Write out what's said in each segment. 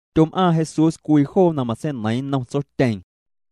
Tyom'aaⁿ Jesús cwii joo na matseineiiⁿ nnom Tsotyeeⁿ.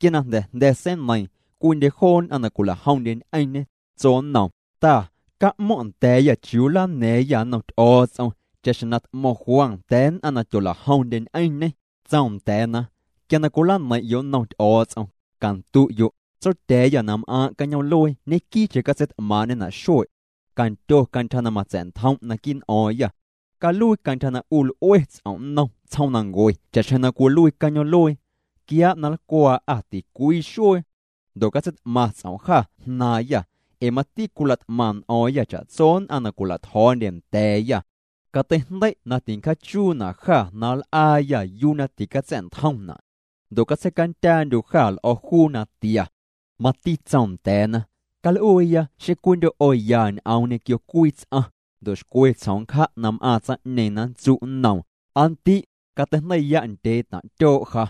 Quia na jnda̱ jnda̱ seineiiⁿ, cwiindye joo nn'aⁿ na cwila'jomndye ñ'eⁿñê, tso nnoom: —Ta, ca'mo̱ⁿ' nda̱a̱yâ chiuu nlana̱a̱ⁿyâ nnom Ty'o̱o̱ts'om, cha'xjeⁿ na t'mo̱ⁿ Juan nda̱a̱ nn'aⁿ na tyola'jomndye ñ'eⁿñê. Tsoom nda̱a̱na: —Quia na cwilaneiⁿ'yo' nnom Ty'o̱o̱ts'om, candu'yo': Tsotya̱a̱yâ na m'aaⁿ' cañoom'luee ñequii'cheⁿ catseit'maaⁿ'ñena' xue'. Candyo cantyja na matsa̱'ntjom' naquii' n'o̱o̱ⁿyâ. Caluii cantyja na 'u l'ue ts'om' nnom tsjoomnancue cha'xjeⁿ na cwiluii cañoom'luee. Quiaa' na nlcwaa'â ticwii xuee. Ndo' catseit'maⁿ ts'om' jâ jnaaⁿyâ, ee mati cwila't'maⁿ n'o̱o̱ⁿyâ cha'tso nn'aⁿ na cwila'tjo̱o̱ndye nda̱a̱yâ. Cateijndei' na tincjaachuuñena' jâ na nl'aayâ yuu na ticatsa̱'ntjomna'. Ndo' catseicandyaandyu' jâ l'o̱ juu natia. Mati tsoom nda̱a̱na: —Cal'uuya xeⁿ cwiindyo' 'o ya ñ'oom ñequio cwii ts'aⁿ, ndo' xcwe tsjom nncja' na m'aaⁿ tsaⁿ'ñeeⁿ na nntsu' nnoom: “Aa ndi', cateijndei'ya' ndyee taⁿ' tyoo' ja.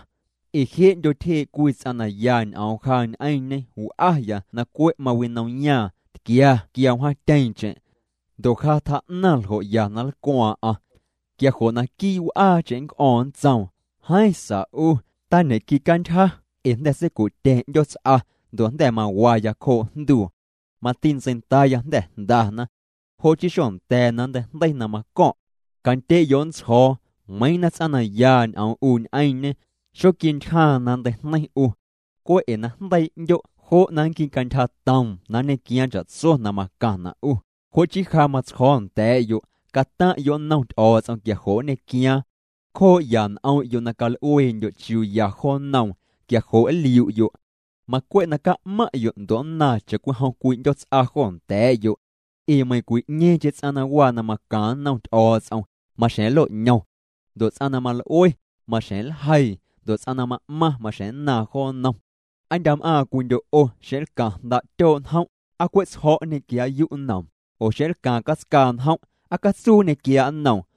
Ee je'ndyo tyjee' cwii ts'aⁿ na ya ñ'oom ja ñ'eⁿñe w'aya na cwe' mawinomyaaⁿ, tquia quia wjaatyeeⁿcheⁿ. Ndo' ja tjaa'naⁿ ljo' ya na nlcwaaⁿ'aⁿ.” Quia jo' naquii' w'aacheⁿ nnc'o̱o̱ⁿ, nntsoom: “Jeeⁿ sa 'u, tañe'quicantyja, ee jnda̱ seicu'tya̱ⁿ 'ndyoots'a, ndo' jnda̱ mawaya cjoo' jnduu. Mati ntseindaaya jnda̱ jndana. Jo' chii xonda̱a̱ na nnteijndei na maco̱ⁿ'.” Candye'yo' nntsjo̱o̱, meiiⁿ na ts'aⁿ na ya ñ'oom 'u ñ'eⁿñe, xoquintyjaaⁿ na nnteijneiⁿ 'u. Cwe' ee na jndeii' 'ndyo', jo' na nnquicantyjatoom na nñequiaaⁿ cha'tso na macaⁿna' 'u. Jo' chii ja matsjo̱o̱ nda̱a̱'yo': Cataⁿ'yo' nnom Ty'o̱o̱ts'om quia jo' nñequiaaⁿ. Cjoo'ya n'om'yo' na cal'uee'ndyo' chiuu ya jo nnoom, quia jo' nliu'yo'. Macwe' na ca'maⁿ'yo' ndo' nnaaⁿ cha'cwijom cwii 'ndyoots'a jo nda̱a̱'yo'. Ee meiⁿcwi'ñeeⁿcheⁿ ts'aⁿ na waa na macaⁿ nnom Ty'o̱o̱ts'om, maxjeⁿ nlo'ñom. Ndo' ts'aⁿ na mal'ue, maxjeⁿ nljeii. Ndo' ts'aⁿ na ma'maⁿ, maxjeⁿ nnaaⁿ jo nnom. Aa ndya' m'aaⁿ cwiindyo' 'o xeⁿ nlcaⁿ jnda' tyoo' njom', ¿aa cwe' tsjo̱' nñequiaa'yu' nnoom? Oo xeⁿ nlcaaⁿ catscaa njom', ¿aa catsuu nñequiaa' nnoom?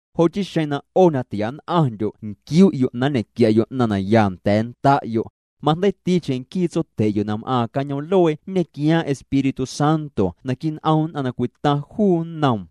Jo' chii xeⁿ na 'o na tia nn'aⁿndyo' nquiu'yo' na nñequia'yo' 'naⁿ na ya nda̱a̱ nda'yo', majndeiiticheⁿ nquii Tsotye'yo' na m'aaⁿ cañoom'luee nñequiaaⁿ Espíritu Santo naquii' n'om nn'aⁿ na cwitaⁿ juu nnoom.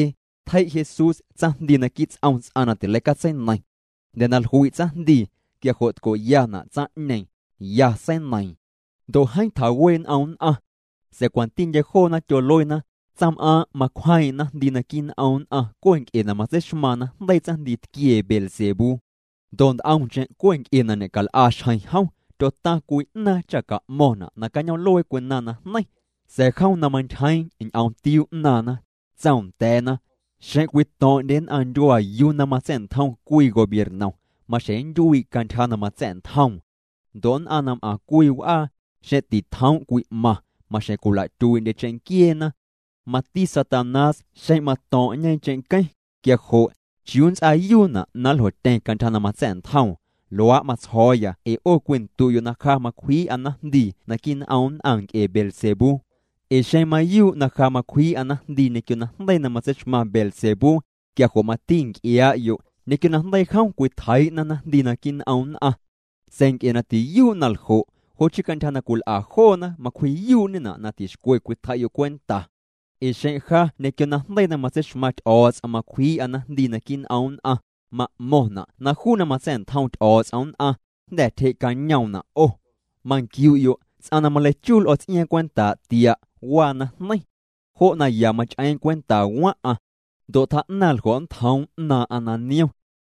Tjei' Jesús tsaⁿjndii naquii' ts'om ts'aⁿ na tileicatseineiⁿ. Jnda̱ na jlui' tsaⁿjndii, quia jo' tco'yana' tsaⁿ'ñeeⁿ, ya seineiiⁿ. Ndo' jeeⁿ tjawee' n'om nn'aⁿ. Sa̱a̱ cwantindye joona tyoluena: —Tsaⁿm'aaⁿ' macwjeeⁿ'eⁿ naⁿjndii naquii' n'om nn'aⁿ cwe' nc'e na matseixmaaⁿ najndeii tsaⁿjndiitquiee Beelzebú. Ndo' nt'omcheⁿ cwe' na ñe'cal'a xjeⁿ jom, tyotaⁿ cwii 'naaⁿ cha ca'mo̱ⁿna' na cañoom'luee cwinaⁿ najneiⁿ. Sa̱a̱ jom na mantyjeeⁿ ñ'omtiuu 'naaⁿna, tsoom nda̱a̱na: —Xeⁿ cwito̱ⁿ'ndye nn'aⁿ ndyuaa yuu na matsa̱'ntjom cwii gobiernom, maxjeⁿ nntyuii' cantyja na matsa̱'ntjoom. Ndo' nn'aⁿ na m'aⁿ cwii w'aa, xeⁿ titjoom' cwi'maⁿ, maxjeⁿ cwila'tyuii'ndye cheⁿnquieena. Mati Satanás xeⁿ mato̱ⁿ'ñe cheⁿnqueⁿ, quia jo' ¿chiuu nnts'aayuuna' na nljotyeⁿ cantyja na matsa̱'ntjoom? Luaa' matsjo̱o̱ya ee 'o cwindu'yo' na ja macwjii'a naⁿjndii naquii' n'om nn'aⁿ nc'e Beelzebú. Ee xeⁿ mayuu' na ja macwjii'a naⁿjndii ñequio najndeii na matseixmaⁿ Beelzebú, quia jo' mati nc'iaa'yo', ñequio najndeii jom cwitjeii'na naⁿjndii naquii' n'om nn'aⁿ. Sa̱a̱ nc'e na tiyuu' na ljo', jo' chii cantyja na cwil'a joona macwji'yuu'ñena' na tixcwe cwitjei'yo' cwenta. Ee xeⁿ ja ñequio najndeii na matseixmaⁿ Ty'o̱o̱ts'om macwjii'a naⁿjndii naquii' n'om nn'aⁿ, ma'mo̱ⁿna' na juu na matsa̱'ntjom Ty'o̱o̱ts'om nn'aⁿ, jnda̱ tyjee'cañoomna' 'o. ’Manquiu'yo' ts'aⁿ na maleichuu l'o̱ ts'iaaⁿ cwentaa' tia', waa najneiⁿ. Jo' na ya mach'eeⁿ cwenta waⁿ'aⁿ. Ndo' tjaa'naⁿ ljo' nntjoom 'naaⁿ'aⁿ na niom.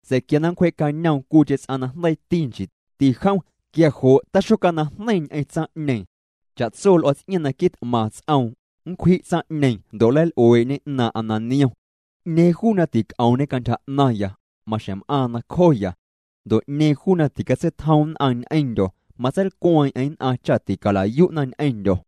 Sa̱a̱ quia nncwjee'cañoom cwiicheⁿ ts'aⁿ na jndeiiti, nchiiti jom, quia jo' taxocanaⁿjneiⁿ ñ'eⁿ tsaⁿ'ñeeⁿ. Cha'tso l'o̱ ts'iaaⁿ na quit'maⁿ ts'oom, nncwji' tsaⁿ'ñeeⁿ ndo' nleil'uee'ñe 'naaⁿ'aⁿ na niom. ’'Ñeeⁿ juu na tic'oomñe cantyja 'naⁿya, maxjeⁿ m'aaⁿ nacjoya. Ndo' 'ñeeⁿ juu na ticatseitjom nn'aⁿ ñ'eⁿndyo̱, matseilcweeⁿ'eⁿ nn'aⁿ cha ticala'yu'na ñ'eⁿndyo̱.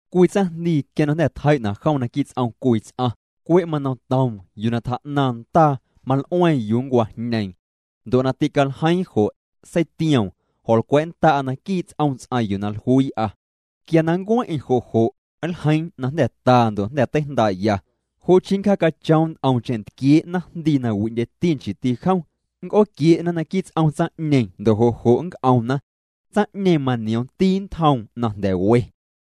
’Cwii tsaⁿjndii quia na jnda̱ tjei'na' jom naquii' ts'om cwii ts'aⁿ, cwe' manomtoom yuu na tjaa'naⁿ ndaa, mal'ueeⁿ yuu nncwajñeeⁿ. Ndo' na tîcaljeiiⁿ jo', seitioom: “Jo̱nlcwa̱'nnda'a naquii' ts'om ts'aⁿ yuu na jluii'a.” Quia na nncueⁿ'eⁿ jo' jo', nljeiiⁿ na jnda̱ taa ndo' jnda̱ teijndaa'ya. Jo' chii nncjaacachoom nt'omcheⁿ ntquiee' naⁿjndii na wi'ndyeti, nchiiti jom. Nnc'ooquie'na naquii' ts'om tsaⁿ'ñeeⁿ ndo' jo' jo' nnc'omna. Tsaⁿ'ñeeⁿ manioomti ntjoom na jnda̱ we.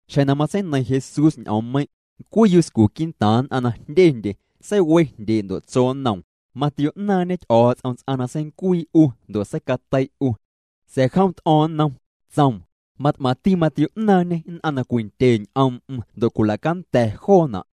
Xjeⁿ na matseineiⁿ Jesús ñ'oommeiⁿ', cwii yuscu quii'ntaaⁿ nn'aⁿ na jndyendye, seiwe jndyee' ndo' tso nnoom: —Matio'naaⁿñe Ty'o̱o̱ts'om ts'aⁿ na seincuii 'u ndo' seicatei' 'u. Sa̱a̱ jom t'o̱o̱ⁿ nnom, tsoom: —Mat'maⁿti matio'naaⁿñê nn'aⁿ na cwindye ñ'oom'm ndo' cwila'canda̱ joona'.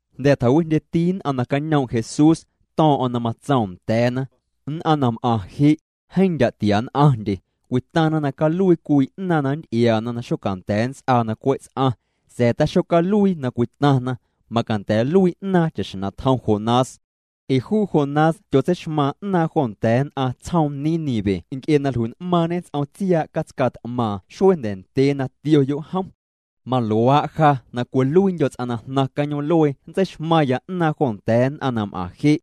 Jnda̱ tjawijndyeti nn'aⁿ na cañoom' Jesús, to̱o̱ⁿ'o̱ⁿ na matsoom nda̱a̱na: —Nn'aⁿ na m'aⁿ je', jeeⁿ ndya' tia nn'aⁿndye. Cwitaⁿna na caluii cwii 'naaⁿ na nnty'iaana na xocanda̱a̱ nnts'aa na cwe' ts'aⁿ, sa̱a̱ taxocaluii na cwitaⁿna, macanda̱ nluii 'naaⁿ cha'xjeⁿ na tjom Jonás. Ee juu Jonás tyotseixmaaⁿ 'naaⁿ jo nda̱a̱ nn'aⁿ tsjoom Nínive nc'e na jlui'n'maaⁿñê ts'om tsiaa' catscaa t'maaⁿ xuee jnda̱ ndyee na tioyo' jom. Maluaa' ja na cwiluiindyo̱ ts'aⁿ na jnaⁿ cañoom'luee nntseixmaⁿya 'naaⁿ jo nda̱a̱ nn'aⁿ na m'aⁿ je'.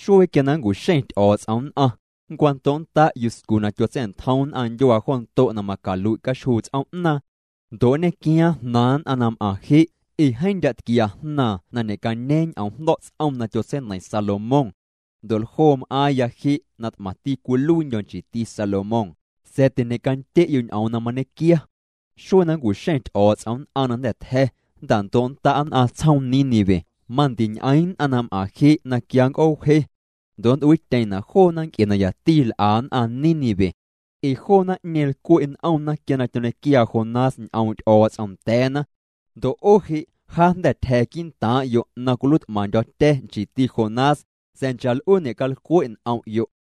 Xuee quia na nncu'xeⁿ Ty'o̱o̱ts'om nn'aⁿ, nncwando'nnda' yuscu na tyotsa̱'ntjom nn'aⁿ ndyuaa jo ndo' na macalui' caxjuu ts'oom'naaⁿ. Ndo' nñequiaaⁿ jnaaⁿ nn'aⁿ na m'aaⁿ je', ee jeeⁿ ndya' tquia jnaaⁿ na ñe'cañeeⁿ ñ'oomjndo̱'ts'om na tyotseineiⁿ Salomón. Ndo' ljoo m'aaⁿya je' na t'maⁿti cwiluiindyo̱, nchiiti Salomón, sa̱a̱ tiñecandye'yo' ñ'oom na mañequia. Xuee na nncu'xeⁿ Ty'o̱o̱ts'om nn'aⁿ na jnda̱ tja̱, nnta'ndo'nnda' nn'aⁿ tsjoom Nínive, mandiñ'eeⁿ nn'aⁿ na m'aaⁿ je' na quia nnc'oowjee. Ndo' nnt'uiityeⁿna' joona nc'e na yati l'a nn'aⁿ Nínive. Ee joo naⁿ'ñeeⁿ lcwe' n'omna quia na tyoñequiaa Jonás ñ'oom' Ty'o̱o̱ts'om nda̱a̱na. Ndo' 'o je', ja jnda̱ tyja̱ quii'ntaaⁿ'yo' na cwiluiit'maⁿndyo̱tya̱, nchiiti Jonás, sa̱a̱ nchaa' l'uu ñe'calcwe' n'om'yo'.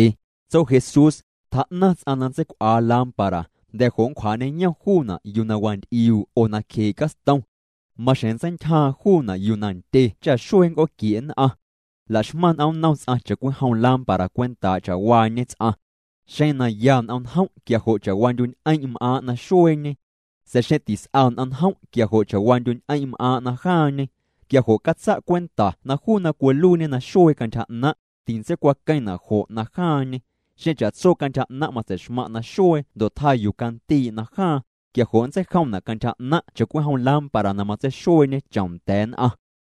Tso Jesús: —Tjaa'naⁿ ts'aⁿ na ntseicw'aa lámpara, jnda̱ jo' nncwjaa'ñeyom juuna' yuu na wanty'iuu' oo nacjee' castom. Maxjeⁿ nntseintyjaaⁿ juuna' yuu na ndye cha xuee nnc'ooquie' nn'aⁿ. La'xmaⁿ n'omnnom ts'aⁿ cha'cwijom lámpara cwentaa' cha'waañe ts'aⁿ. Xeⁿ na ya n'omnjom' quia jo' cha'waandyu'ñ'eⁿ' m'aaⁿ' na xueeñe. Sa̱a̱ xeⁿ tis'a n'omnjom' quia jo' cha'waandyu'ñ'eⁿ' m'aaⁿ' na jaaⁿñe. Quia jo' catsa' cwenta na juu na cwiluiiñe naxuee cantyja 'naⁿ', tintseicwaqueⁿna' jo' najaaⁿñe. Xeⁿ cha'tso cantyja 'naⁿ' matsei'xmaⁿ' naxuee ndo' tjaa yuu candii' najaaⁿ, quia jo' nntseijomna' cantyja 'naⁿ' cha'cwijom lámpara na matseixueeñe chom nda̱a̱ nn'aⁿ.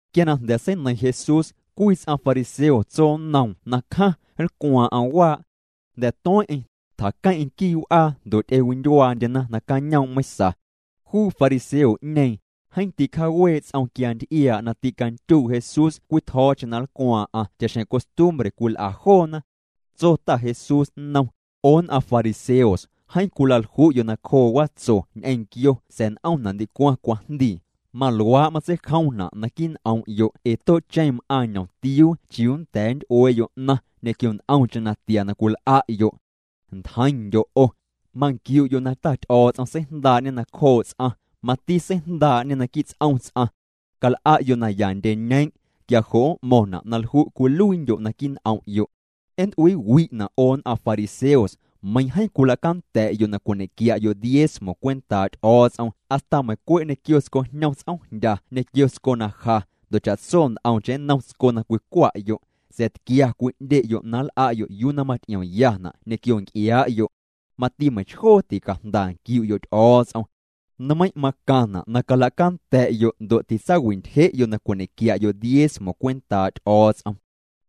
Quia na jnda̱ seineiⁿ Jesús, cwii ts'aⁿ fariseo tso nnoom na cjaⁿ, nlcwaaⁿ'aⁿ waa'. Jnda̱ tueⁿ'eⁿ, tjaqueⁿ'eⁿ quii' w'aa ndo' ty'ewindyuaandyena nacañoom' meiⁿsa. Juu fariseo'ñeeⁿ, jeeⁿ ticjaawee' ts'om quia nty'iaa' na ticandyuu' Jesús cwii tjo̱o̱cheⁿ na nlcwaaⁿ'aⁿ cha'xjeⁿ costumbre cwil'a joona. Tso Ta Jesús nnom: —'O nn'aⁿ fariseos, jeeⁿ cwilalju'yo' nacjoo watso ñ'eⁿ nquio sa̱a̱ n'omna' ndicwaⁿ cwajndii. Maluaa' matseijomna' naquii' n'om'yo' ee too'cheⁿ m'aaⁿ ñomtiuu chiuu nnda̱a̱ nnty'uee'yo' 'naⁿ ñequio nt'omcheⁿ natia na cwil'a'yo'. Ntjeiⁿndyo' 'o. Manquiu'yo' na Ty'o̱o̱ts'om seijndaa'ñê nacjoo' ts'aⁿ, mati seijndaa'ñê naquii' ts'om ts'aⁿ. Cal'a'yo' naya ndyeñeeⁿ', quia jo' m'mo̱ⁿna' na lju' cwiluiindyo' naquii' n'om'yo'. ’Nnt'uiiwi'na' 'o nn'aⁿ fariseos, meiiⁿ jeeⁿ cwilacanda̱'yo' na cwiñe'quia'yo' diezmo cwentaa' Ty'o̱o̱ts'om hasta meiiⁿ cwe' ñequio tscojñom ts'oomjndya ñequio tsco na ja, ndo' cha'tso nt'omcheⁿ nnom tsco na cwicwa'yo', sa̱a̱ tquia cwi'ndye'yo' na nl'a'yo' yuu na maty'iomyana' ñequio nc'iaa'yo'. Mati meiⁿchjoo ticajnda nquiu'yo' Ty'o̱o̱ts'om. Nmeiⁿ' macaⁿna' na calacanda̱'yo' ndo' titsaawi'ntyje'yo' na cwiñe'quia'yo' diezmo cwentaa' Ty'o̱o̱ts'om.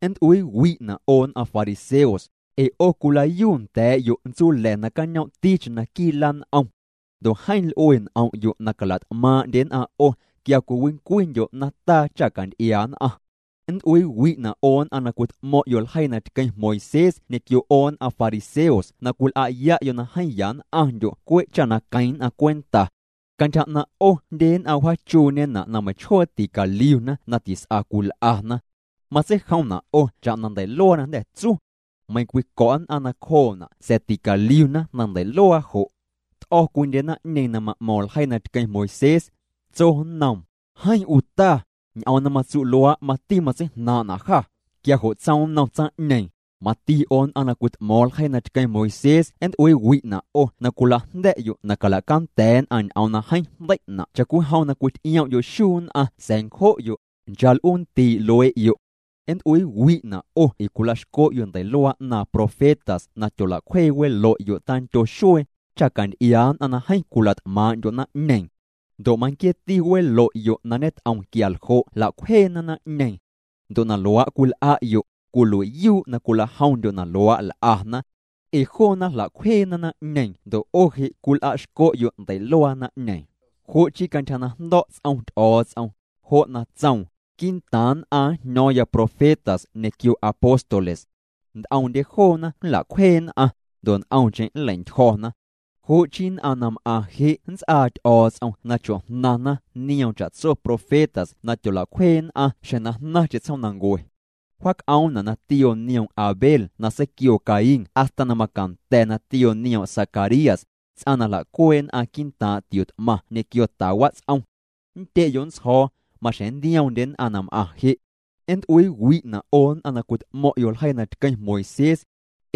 ’Nnt'uiiwi'na' 'o nn'aⁿ fariseos, ee 'o cwilayuunda̱a̱'yo' ntsula̱ na cañoomticheⁿ naquii' lan'om. Ndo' jeeⁿ l'ue n'om'yo' na cala't'maaⁿ'ndye nn'aⁿ 'o quia cwiwincwindyo' nataa cha canty'iaa nn'aⁿ. ’Nnt'uiiwi'na' 'o nn'aⁿ na cwit'mo̱ⁿ'yo' ljeii na tqueⁿ Moisés ñequio 'o nn'aⁿ fariseos na cwil'a'ya'yo' na jeeⁿ yann'aⁿndyo' cwe' cha queⁿ nn'aⁿ cwenta. Cantyja 'naⁿ' 'o jndye nn'aⁿ wjaachuuñena' na meiⁿchjoo ticaliuna na tis'a cwil'ana. Matseijomna' 'o cha'na ndei'luaa na jnda̱ tsu. Meiiⁿ cwico̱' nn'aⁿ nacjoona' sa̱a̱ ticaliuna na ndei'luaa jo'.” T'o̱ cwiindye naⁿ'ñeeⁿ na ma'mo̱ⁿ ljeii na tqueⁿ Moisés. Tso nnoom: —Jeeⁿ 'u Ta, ñ'oom na matsu' luaa', mati matseijnaaⁿ'na' jâ. Quia jo' tsoom nnom tsaⁿ'ñeeⁿ: —Mati 'o nn'aⁿ na cwit'mo̱o̱ⁿ ljeii na tqueⁿ Moisés nnt'uiiwi'na' 'o na cwila'jnda̱'yo' na cala'canda̱ nn'aⁿ ñ'oom na jeeⁿ jndei'na' cha'cwijom na cwity'iom'yo' xuu nn'aⁿ sa̱a̱ ncjo'yo', nchaa' l'uu nntii' luee'yo'. ’Nnt'uiiwi'na' 'o ee cwil'a'xco'yo' ndei'luaa 'naaⁿ profetas na tyola'cwje welo'yo' tandyo xuee, cha canty'iaa nn'aⁿ na jeeⁿ cwila't'maaⁿ'ndyo' naⁿ'ñeeⁿ. Ndo' manquieeti welo'yo' na ñet'om quia ljo' jla'cwjeena naⁿ'ñeeⁿ. Ndo' na luaa' cwil'a'yo', cwilui'yuu' na cwilajomndyo' na luaa' l'ana. Ee joona jla'cwjeena naⁿ'ñeeⁿ ndo' 'o je' cwil'a'xco'yo' ndei'luaa naⁿ'ñeeⁿ. ’Jo' chii cantyja na jndo̱' ts'om Ty'o̱o̱ts'om, jo' na tsoom: “Quii'ntaaⁿ nn'aⁿ njño̱o̱ⁿya profetas ñequio apóstoles. Nt'omndye joona nla'cwjee nn'aⁿ, ndo' nt'omcheⁿ nlei'ntyjo̱na.” Jo' chii, nn'aⁿ na m'aⁿ je' nnts'aa Ty'o̱o̱ts'om na chojnaⁿna nioom cha'tso profetas na tyola'cwjee nn'aⁿ xjeⁿ na jnaⁿcheⁿ tsjoomnancue. Wjaac'oomna' na tioo nioom' Abel na seiquioo Caín hasta na macanda̱ na tioo nioom' Zacarías, ts'aⁿ na jla'cuee' nn'aⁿ quii'ntaaⁿ' tio t'maⁿ ñequio ta wats'om. Nndye'yo' nntsjo̱o̱, maxjeⁿ nntioomndye nn'aⁿ na m'aⁿ je'. ’Nnt'uiiwi'na' 'o nn'aⁿ na cwit'mo̱ⁿ'yo' ljeii na tqueⁿ Moisés.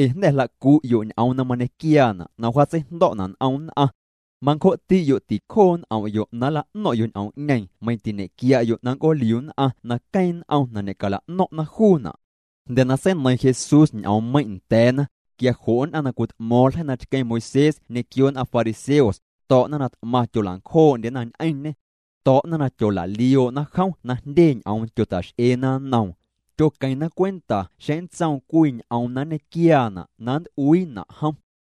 Ee jnda̱ jla'cu'yo' ñ'oom na mañequiaana' na wjaatseijndo̱'na' n'om nn'aⁿ. Mancjo'ti'yo' ticjoo' n'om'yo' na nla'no̱ⁿ'yo' ñ'oom'ñeeⁿ meiⁿ tiñe'quia'yo' na nnc'ooliu nn'aⁿna queeⁿ n'om na ñecala'no̱ⁿ'na juuna'. Jnda̱ na seineiⁿ Jesús ñ'oommeiⁿ' nda̱a̱na, quia jo' nn'aⁿ na cwit'mo̱o̱ⁿ ljeii na tqueⁿ Moisés ñequio nn'aⁿ fariseos, to̱'na na t'maⁿ tyola'ncjoo'ndyena ñ'eⁿñê. To̱'na na tyola'lioo'na jom na jndye ñ'oom tyota'x'eena nnoom. Tyoqueⁿna cwenta xeⁿ nntsoom cwii ñ'oom na nñequiaana' na nt'uiina' jom.